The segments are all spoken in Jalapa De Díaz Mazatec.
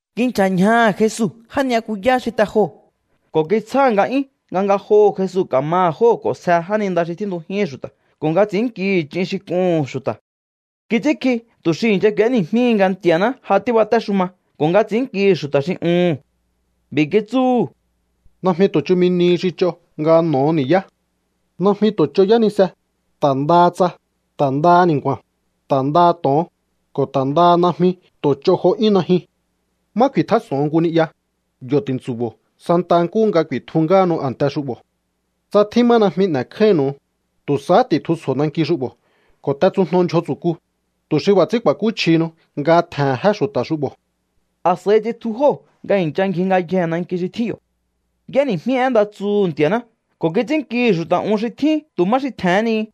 Kinchja̱ ñjaha̱ Jesu já ni'yakuyá xi te joho̱ ko̱ kitsjáha̱ nga'yún nga ngajoho̱ Jesu ka̱maha̱ jóo̱ k'o̱nsje jáninda xi tjíntujíhi̱n xu̱ta̱ ko̱ nga ts'i̱ínnkihi̱ ch'in xi k'uhu̱n xu̱ta̱. Kits'ínkji tu̱ xi i̱ncha k'u̱éni̱jmíhi nga Nti̱a̱ná ja tíbatéxuma ko̱ nga ts'i̱ínnkihi̱ xu̱ta̱ xi uhu̱n. B'i̱ kitsúhu̱: —Najmi tu̱ chumi nihi xi ch'o nga n'o̱o ni̱yá. Najmi tu̱ ch'o yánise, ta̱ ndaha tsa, ta̱ ndaha ni̱nku̱a̱n, ta̱ ndaha to̱on, ko̱ ta̱ ndaha najmi tu̱ ch'o jo 'yún najyun. Má ku̱i̱tjás'o̱on nku ni'ya, yo̱ ti̱ntsu̱bo̱o santa nkúhu nga ku̱i̱tju ngáhanu a̱nte xu'bo̱. Tsa tjín má najmi n'e̱kjáínnu̱u, tu̱ sahá ti̱tjusjo̱o nanki xu'bo̱ ko̱ t'etsujno ndyjo tsu̱ku, tu̱ xi b'a̱ ts'ín ku̱a̱kúchjihinu nga tje̱he̱n jé xu̱ta̱ xu'bo̱. A̱s'a̱i tsitju jóo̱ nga i̱ncha ngji ngayjee̱ nanki xi tjín yo̱. Y'éni̱jmí én nda tsuhu̱ Nti̱a̱ná ko̱ kits'ínnkihi̱ xu̱ta̱ un xi tjín tu̱ má xi tje̱hén ni.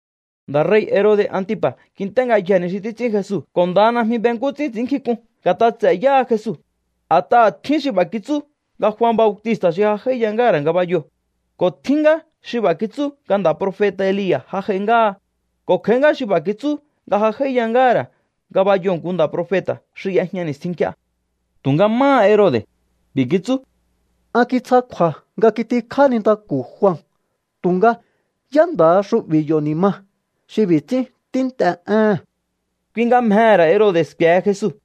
Nda̱ rei̱ Herode̱ Antipa̱ kint'é ngayjee̱ ni xi títs'ín Jesu ko̱ ndaha najmi be nkú ts'ín ts'i̱ínnkjink'un nga̱t'a ts'e̱ yáha Jesu. A̱t'aha̱ tjín xi b'a̱ kitsú nga Jua Bautista̱ xi ja j'áíya ngáha̱ ra̱ ngabayoo̱, ko̱ tjín ngá xi b'a̱ kitsú nga nda̱ profeta̱ Elia̱ ja j'ai ngáha, ko̱ kj'a̱í ngá xi b'a̱ kitsú nga ja j'áíya ngáha̱ ra̱ ngabayoo̱ nku nda̱ profeta̱ xi y'ejña ni̱stjin nk'ie. Tu̱nga máha Herode̱, b'i̱ kitsú: —An kitsja kju̱a̱ nga kitikjá nintaku̱ Jua. Tu̱nga, ¿yá nda̱ha xu'bi̱ yo̱ ni̱ ma, xi b'i̱ ts'ín tínt'e éhe̱n? Kui nga mjehe̱ ra̱ Herode̱ sku̱e̱he Jesu.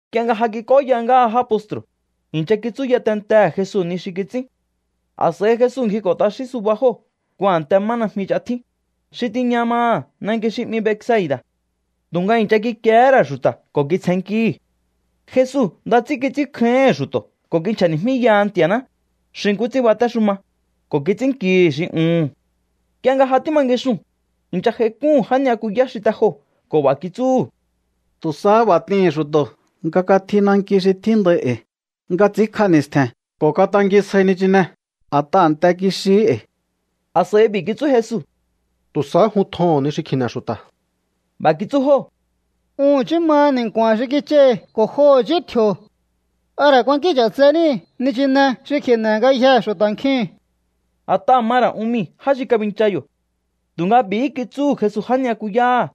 Nk'ie nga ja kik'óya ngáha já postru̱, i̱ncha kitsúya tentehe̱ Jesu ni xi kits'ín. A̱s'a̱i Jesu ngjiko̱ t'axín suba jóo̱ nku a̱nte má najmi ch'a tjín, xi tiña maha̱ nanki xi 'mi Betsaida̱. Tu̱nga i̱ncha kikiehé ra̱ xu̱ta̱ ko̱ kitsjennkíhi̱. Jesu nda ts'ín kits'ínkjáíhi̱n xu̱to̱ ko̱ kinchja̱ni̱jmíyaha Nti̱a̱ná, xi nkú ts'ín batéxuma, ko̱ kits'ínnkihi̱ xi uhu̱n. Nk'ie nga ja tíma ngixun, i̱ncha j'aik'úhu̱n já ni'yakuyá xi te joo̱ ko̱ b'a̱ kitsúhu̱: —Tu̱ sahá b'a̱ t'ihi̱n xu̱to̱ nga katji nanki xi tjíndai e̱i̱ nga ts'ínkj'a ni̱stje̱n ko̱ katangisjáí nichine, a̱t'aha̱ a̱nte kixihí e̱i̱. A̱s'a̱i b'i̱ kitsú Jesu: —Tu̱ sahá jun tjoho̱on ni xi kji̱ne̱ xu̱ta̱. B'a̱ kitsú jóo̱: —Un i̱chí maha ni̱nku̱a̱n xi kich'ai̱ ko̱ jo i̱chí tji̱o̱. ¿A ra̱ kuankín ch'atse níi̱ nichine xi kji̱ne̱ ngayjee̱ xu̱ta̱ nkjiu̱n? A̱t'aha̱ ma ra̱ un mii̱ já xi kabincha yo̱. Tu̱nga b'i̱hí kitsúhu̱ Jesu já ni'yakuyáha̱: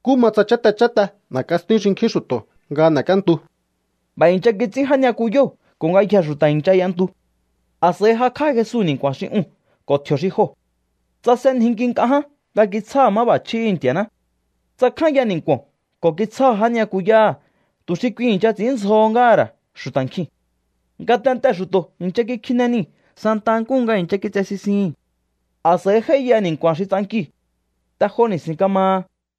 —Nkú ma tsa cháte cháte n'e̱k'a stíún xinkjín xu̱to̱ nga n'e̱k'íéntu. B'a̱ i̱ncha kits'ín já ni'yakuyóo̱ ko̱ ngayjee̱ xu̱ta̱ i̱ncha y'entu. A̱s'a̱i jakj'á Jesu ni̱nku̱a̱n xi uu̱n ko̱ tji̱o̱ xi joo̱. Tsasenjinki nk'a ján nga kitsjáha̱ máb'a̱chjíhi̱ Nti̱a̱ná. Tsakjánya ni̱nku̱o̱n ko̱ kitsjáha̱ já ni'yakuyáha̱ tu̱ xi kui i̱ncha ts'i̱ínndzjo ngáha̱ ra̱ xu̱ta̱ nkjiu̱n. Ngatentee̱ xu̱to̱ i̱ncha kikjine niu̱ santa nkúhu nga i̱ncha kitse sisihi̱n. A̱s'a̱i j'áíya ni̱nku̱a̱n xi ts'ankiu̱. Te jo ni̱si̱n kamaha.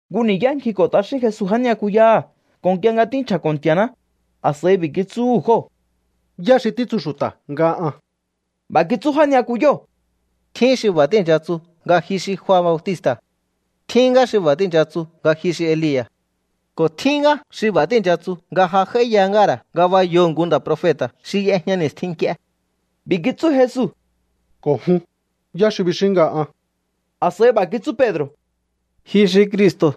Nku ni̱yá ngjiko̱ t'axín Jesu já ni'yakuyáha̱ ko̱ nk'ie nga tínchja̱ko̱ Nti̱a̱ná, a̱s'a̱i b'i̱ kitsúhu̱ jóo̱: —¿Yá xi títsu xu̱ta̱ nga an? B'a̱ kitsú já ni'yakuyóo̱: —Tjín xi b'a̱ tíi̱ncha tsu nga ji xi Jua Bautista̱. Tjín ngá xi b'a̱ tíi̱ncha tsu nga ji xi Elia̱. Ko̱ tjín ngá xi b'a̱ tíi̱ncha tsu nga ja j'áíya ngáha̱ ra̱ ngabayoo̱ nku nda̱ profeta̱ xi y'ejña ni̱stjin nk'ie. B'i̱ kitsú Jesu: —Ko̱ jun, ¿yá xi bixíún nga an? A̱s'a̱i b'a̱ kitsú Pedro̱: —Ji xi Cristo̱.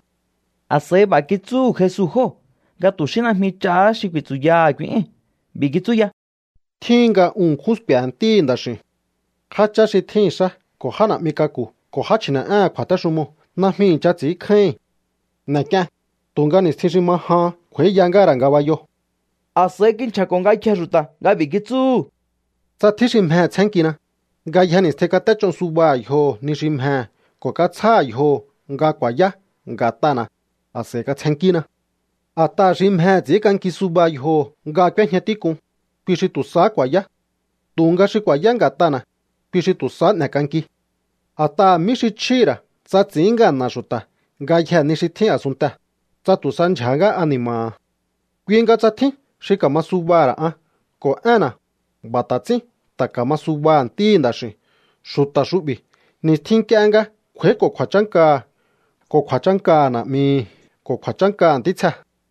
A̱s'a̱i b'a̱ kitsúhu̱ Jesu jóo̱ nga tu̱ xí najmi ch'ahá xi ku̱i̱tsu̱yaha̱ kui éi̱n. B'i̱ kitsú ya: —Tjíhin nga un ṉkjún sku̱e̱he̱ Ntíhi̱ Nda̱x'i̱u̱n. Jáchá xi tjíhi̱n xá ko̱ já na̱'mi k'aku̱ ko̱ já chji̱ne̱'éhe̱n kju̱a̱téxumoo̱ najmi i̱ncha ts'i̱ínkjáíhi̱n. N'e̱k'ien, tu̱nga ni̱stjin xi ma jahan kj'u̱a̱íya ngáha̱ ra̱ ngabayoo̱. A̱s'a̱i kinchja̱ko̱ ngayjee̱ xu̱ta̱ nga b'i̱ kitsúhu̱: —Tsa tjín xi mjehe̱ tsjénnkina, ngayje ni̱stjin kat'éch'o subaha̱ yjoho̱ ni xi mjehe̱ ko̱ katsjáha̱ yjoho̱ nga ku̱a̱yá nga̱t'ana̱, a̱s'a̱i katsjennkína. A̱t'aha̱ xi mjehe̱ ts'i̱ínk'anki suba yjoho̱ nga k'úéjña tík'un, kui xi tu̱ sahá ku̱a̱yá. Tu̱nga xi ku̱a̱yá nga̱t'ana̱, kui xi tu̱ sahá n'e̱k'anki. ¿A̱t'aha̱ mí xi chjíhi̱ ra̱ tsa ts'i̱ín ngana̱ xu̱ta̱ ngayjee̱ ni xi tjín a̱sunntee̱, tsa tu̱ sa ndyja̱há ngá ani̱ma̱ha̱? ’Kui nga tsa tjín xi ka̱ma subaha̱ ra̱ an ko̱ énna̱, b'a̱ ta̱ ts'ín ta̱ ka̱ma subaha̱ Ntíhi̱ Nda̱x'i̱u̱n xu̱ta̱ xu'bi̱ ni̱stjin nk'ie nga kj'u̱a̱íko̱ kju̱a̱chánkaha̱ ko̱ kju̱a̱chánkaha̱ Na̱'mihi̱ ko̱ kju̱a̱chánkaha̱ ntítsjehe̱.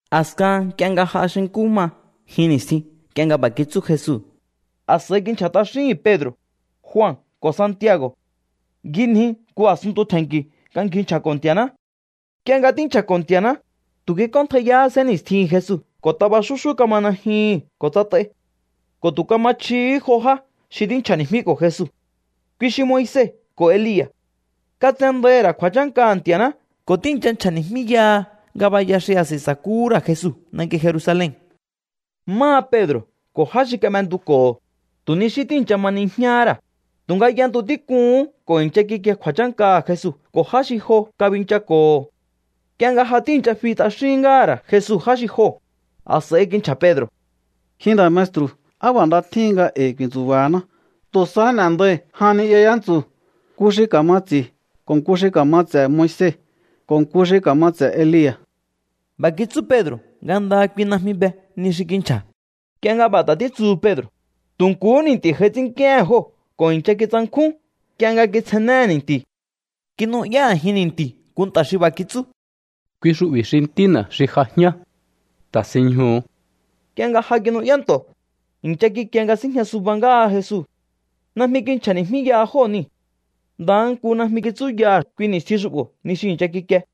A̱skahan nk'ie nga j'a xi nkú ma jin ni̱stjin nk'ie nga b'a̱ kitsú Jesu, a̱s'a̱i kinchja̱ t'axíhi̱n Pedro̱, Jua ko̱ Santiago̱. Ngjinji nku a̱sunntu tje̱nki̱ nga ngji nchja̱ko̱ Nti̱a̱ná. Nk'ie nga tínchja̱ko̱ Nti̱a̱ná, tu̱ kik'óntjaiyahá sénni̱stjihi̱n Jesu ko̱ taba xúxú kama najyuhu̱n ko̱ tsat'ai. Ko̱ tu̱ kama chjihí jo já xi tínchja̱ni̱jmíko̱ Jesu, kui xi Moise ko̱ Elia̱. Katsendaihi̱ ra̱ kju̱a̱chánkaha̱ Nti̱a̱ná ko̱ tíi̱ncha nchja̱ni̱jmíyaha ngabaya xi a̱s'a̱i sa̱kúhú ra̱ Jesu nanki Jerusalen. Máha Pedro̱ ko̱ já xi kab'entuko̱ho̱, tu̱ ni xí tíi̱ncha ma nijñáhá ra̱, tu̱nga y'entu tík'uhún ko̱ i̱ncha kikie kju̱a̱chánkaha̱ Jesu ko̱ já xi jo kabinchako̱ho̱. Nk'ie nga ja tíi̱ncha fi t'axín ngáha̱ ra̱ Jesu já xi joo̱, a̱s'a̱i kinchja̱ Pedro̱: —Ji nda̱ maestru̱, ¡á b'a̱ nda tjíhin nga e̱i̱ ku̱i̱ntsu̱ba̱haná! Tu̱ sahá n'e̱ndai̱ jan ni'ya yántsu̱, nku xi ka̱ma ts'i̱ ko̱ nku xi ka̱ma ts'e̱ Moise ko̱ nku xi ka̱ma ts'e̱ Elia̱. B'a̱ kitsú Pedro̱ nga ndaha kui najmi be ni xi kinchja̱. Nk'ie nga b'a̱ ta̱ títsuhu Pedro̱, tu̱ nkuhú ni̱nti̱ j'ai ts'ínnk'íéhe̱n jóo̱ ko̱ i̱ncha kitsankjún nk'ie nga kitsjennéhe̱ ni̱nti̱u̱. Kinu'yá a̱jin ni̱nti̱u̱ nku nta̱ xi b'a̱ kitsú: —Kui xu'bi̱ xi Ntína̱ xi j'ajíán. Ta̱sinñjuhu̱u. Nk'ie nga ja kinu'yá nto̱, i̱ncha kikie nga síjña suba ngáha Jesu. Najmi kinchja̱ni̱jmíyaha jóo̱ niu̱. Ndaha nku najmi kitsúyaha̱ kui ni̱stjin xu'bo̱ ni xi i̱ncha kikie.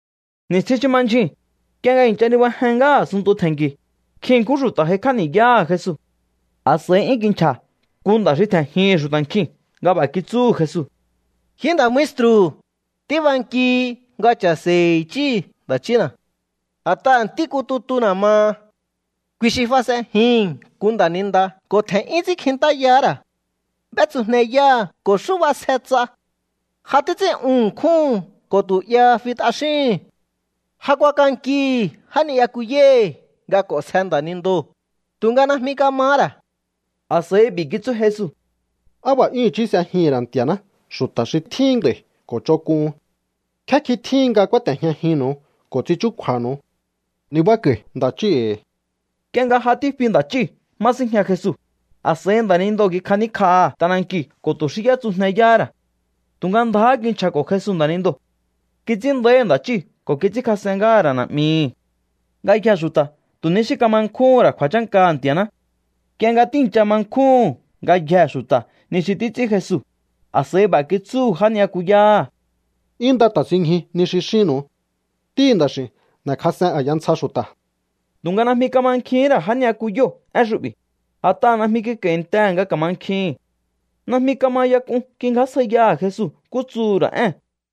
Ni̱stjin xi ma ndyjuu̱n, nk'ie nga i̱ncha nibajen ngáha a̱sunntu tje̱nki̱u̱, nkjin ṉkjún xu̱ta̱ j'aikj'á ni̱yáha̱ Jesu. A̱s'a̱i 'yún kinchja̱ nku nda̱ xi tje̱njihi̱n xu̱ta̱ nkjiu̱n nga b'a̱ kitsúhu̱ Jesu: —Ji nda̱ maestru̱, tíbankihi nga cha̱se̱i̱hi̱ i̱chí nda̱ chína̱. A̱t'aha̱ ntí nku tutuna̱ maha. Kui xi fas'enjihi̱n nku nda̱ninda ko̱ tje̱n'yún ts'ínkjintáyahá ra̱. B'étsujneyáha̱ ko̱ xú b'asje ts'a. Ja títs'ín'un ṉkjúhu̱n ko̱ tu̱ 'yaha fi t'axíhi̱n. Ja kuakankihi̱ já ni'yakuyáhi̱ nga k'o̱nsje nda̱nindoo̱, tu̱nga najmi kamahá ra̱. A̱s'a̱i b'i̱ kitsú Jesu: —¡Á b'a̱ 'yún i̱chí s'ejihi̱n ra̱ Nti̱a̱ná xu̱ta̱ xi tjíhin nd'a̱i̱ ko̱ ch'onk'uhun! ¿Nkjé kjin tjíhin nga kúáte̱jñajinnu̱u ko̱ ts'in chúkju̱a̱nu̱u? Nibáko̱i̱ nda̱ chíhi̱ e̱i̱. Nk'ie nga ja tífi nda̱ chíu̱ má síjña Jesu, a̱s'a̱i nda̱nindoo̱ kikjaníkj'aha̱ t'anankiu̱ ko̱ tu̱ xí y'étsujneyáhá ra̱. Tu̱nga ndjáhá kinchja̱ko̱ Jesu nda̱nindoo̱. Kits'ín nda̱íhi̱ nda̱ chíu̱ ko̱ kits'ínkjas'en ngáha̱ ra̱ na̱'mihi. Ngayjee̱ xu̱ta̱ tu̱ ni xí kama nkjúhún ra̱ kju̱a̱chánkaha̱ Nti̱a̱ná. Nk'ie nga tíi̱ncha ma nkjúhu̱n ngayjee̱ xu̱ta̱ ni xi títs'ín Jesu, a̱s'a̱i b'a̱ kitsúhu̱ já ni'yakuyáha̱: —'Yún nda ta̱sinñju ni xi xínnu̱u. Ntíhi̱ Nda̱x'i̱u̱n n'e̱kjas'en a̱ya ntsja xu̱ta̱. Tu̱nga najmi kamankjihín ra̱ já ni'yakuyóo̱ én xu'bi̱, a̱t'aha̱ najmi kik'a̱i̱ntehe̱ nga ka̱mankjihi̱n. Najmi kama ya k'un kingjásjaiyaha̱ Jesu nkú tsuhu̱ ra̱ ée̱n.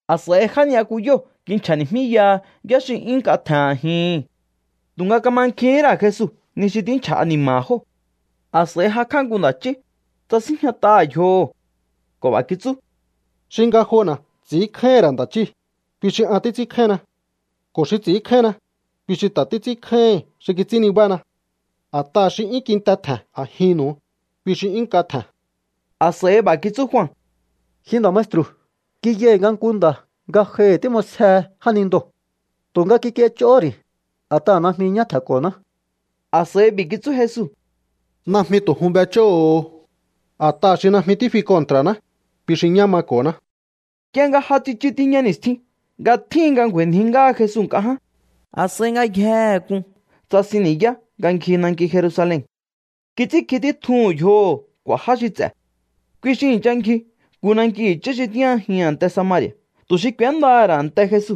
A̱s'a̱i já ni'yakuyóo̱ kinchja̱ni̱jmíyaha yá xi 'yún nk'a tje̱n a̱jihi̱n. Tu̱nga kamankjihín ra̱ Jesu ni xi tínchja̱ ani̱ma̱ha̱ jóo̱. A̱s'a̱i jakj'á nku nda̱ chí, tsasínjñat'aha̱ yjoho ko̱ b'a̱ kitsú: —Xi ngajona̱ ts'i̱ínkjáíhi̱n ra̱ nda̱ chíi̱, kui xi an títs'ínkjáínna. Ko̱ xi ts'i̱ínkjáínna, kui xi ta̱ títs'ínkjáíhi̱n xi kits'ín nibána. A̱t'aha̱ xi 'yún kinte tje̱n a̱jinnu̱u, kui xi 'yún nk'a tje̱n. A̱s'a̱i b'a̱ kitsú Jua: —Ji nda̱ maestru̱, kiyai̱ nga nku nda̱ ngajohi̱ tím'osjehe jánindoo̱. Tu̱nga kik'iech'ohó ri̱, a̱t'aha̱ najmi ñá tje̱nko̱ná. A̱s'a̱i b'i̱ kitsú Jesu: —Najmi tu̱ jun b'ech'óho̱o. A̱t'aha̱ xi najmi tífi kontra̱ná, kui xi ñá mako̱ná. Nk'ie nga ja tsichu tiña ni̱stjin nga tjíhin nga ngju̱a̱i̱nji ngáha Jesu nk'a ján, a̱s'a̱i ngayjehe k'un tsasin ni̱yá nga ngji nanki Jerusalen. Kits'ínkji títjuhu̱n yjoho̱ k'u̱a̱ já xi ts'e̱. Kui xi i̱ncha ngji nku nanki i̱chí xi tíjñajihi̱n a̱nte Samari̱a̱ tu̱ xi k'u̱éndaha̱ ra̱ a̱nte Jesu.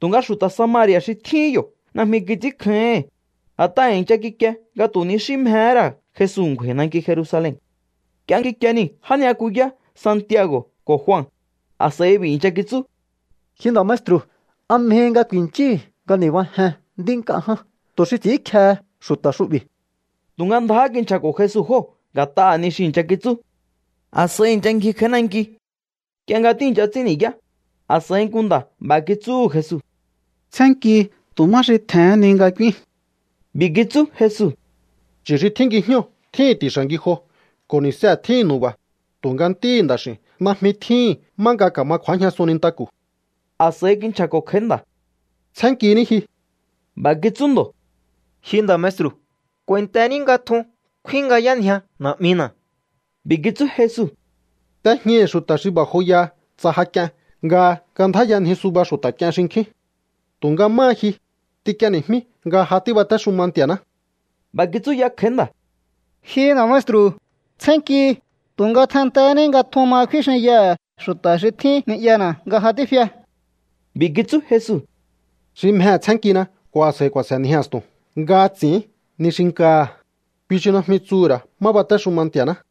Tu̱nga xu̱ta̱ Samari̱a̱ xi tjíhín yo̱ najmi kits'ínkjáíhi̱n, a̱t'aha̱ i̱ncha kikie nga tu̱ ni xí mjehé ra̱ Jesu ngju̱a̱i̱ nanki Jerusalen. Nk'ie kikie nii̱ já ni'yakuyá Santiago̱ ko̱ Jua, a̱s'a̱i b'i̱ i̱ncha kitsú: —Ji nda maestru̱, ¿a mjehi nga ku̱i̱nchíi̱ nga ni̱bájen nd'í nk'a ján tu̱ xi ts'i̱ínkjehe xu̱ta̱ xu'bi̱? Tu̱nga ndjáhá kinchja̱ko̱ Jesu jóo̱ nga̱t'aha̱ ni xi i̱ncha kitsú. A̱s'a̱i i̱ncha ngji kj'a̱í nanki. Nk'ie nga tíi̱ncha ts'ín ni̱yá, a̱s'a̱i nku nda̱ b'a̱ kitsúhu̱ Jesu: —Tsjénnkihi tu̱ má xi tje̱hén ni nga k'úín. B'i̱ kitsú Jesu: —Chu̱ xi tjín ngijñóo̱ tjíhi̱n ti̱xa̱ ngijo ko̱ ni̱see̱ tjíhi̱n nu̱ba̱, tu̱nga Ntíhi̱ Nda̱x'i̱u̱n najmi tjíhi̱n má nga ka̱ma kju̱ájñasun nintaku̱. A̱s'a̱i kinchja̱ko̱ kj'a̱í nda̱: —Tsjénnkiní ji. B'a̱ kitsú ndo̱: —Ji nda̱ maestru̱, k'u̱a̱i̱ntení nga tjun kfínngjayánjia na̱'mina̱. B'i̱ kitsú Jesu: —T'ejñaihi̱ xu̱ta̱ xi b'a̱ joyaha tsa ja k'ien nga kandjáyanji suba xu̱ta̱ k'ien xinkjín. Tu̱nga máha ji, t'ink'ieni̱jmí nga ja tíbatéxuma Nti̱a̱ná. B'a̱ kitsú ya kj'a̱í nda̱: —Ji nda̱ maestru̱, tsjénnkihi, tu̱nga tjenntehéní nga tjun ma kfín xinyaha̱ xu̱ta̱ xi tjín ni'yana̱ nga ja tífia. B'i̱ kitsú Jesu: —Xi mjehe̱ tsénnkina ko̱ a̱s'a̱i ku̱a̱se̱nji a̱stu̱n nga ts'i̱ín ni xi nkaha̱, kui xi najmi tsuhu̱ ra̱ má batéxuma Nti̱a̱ná.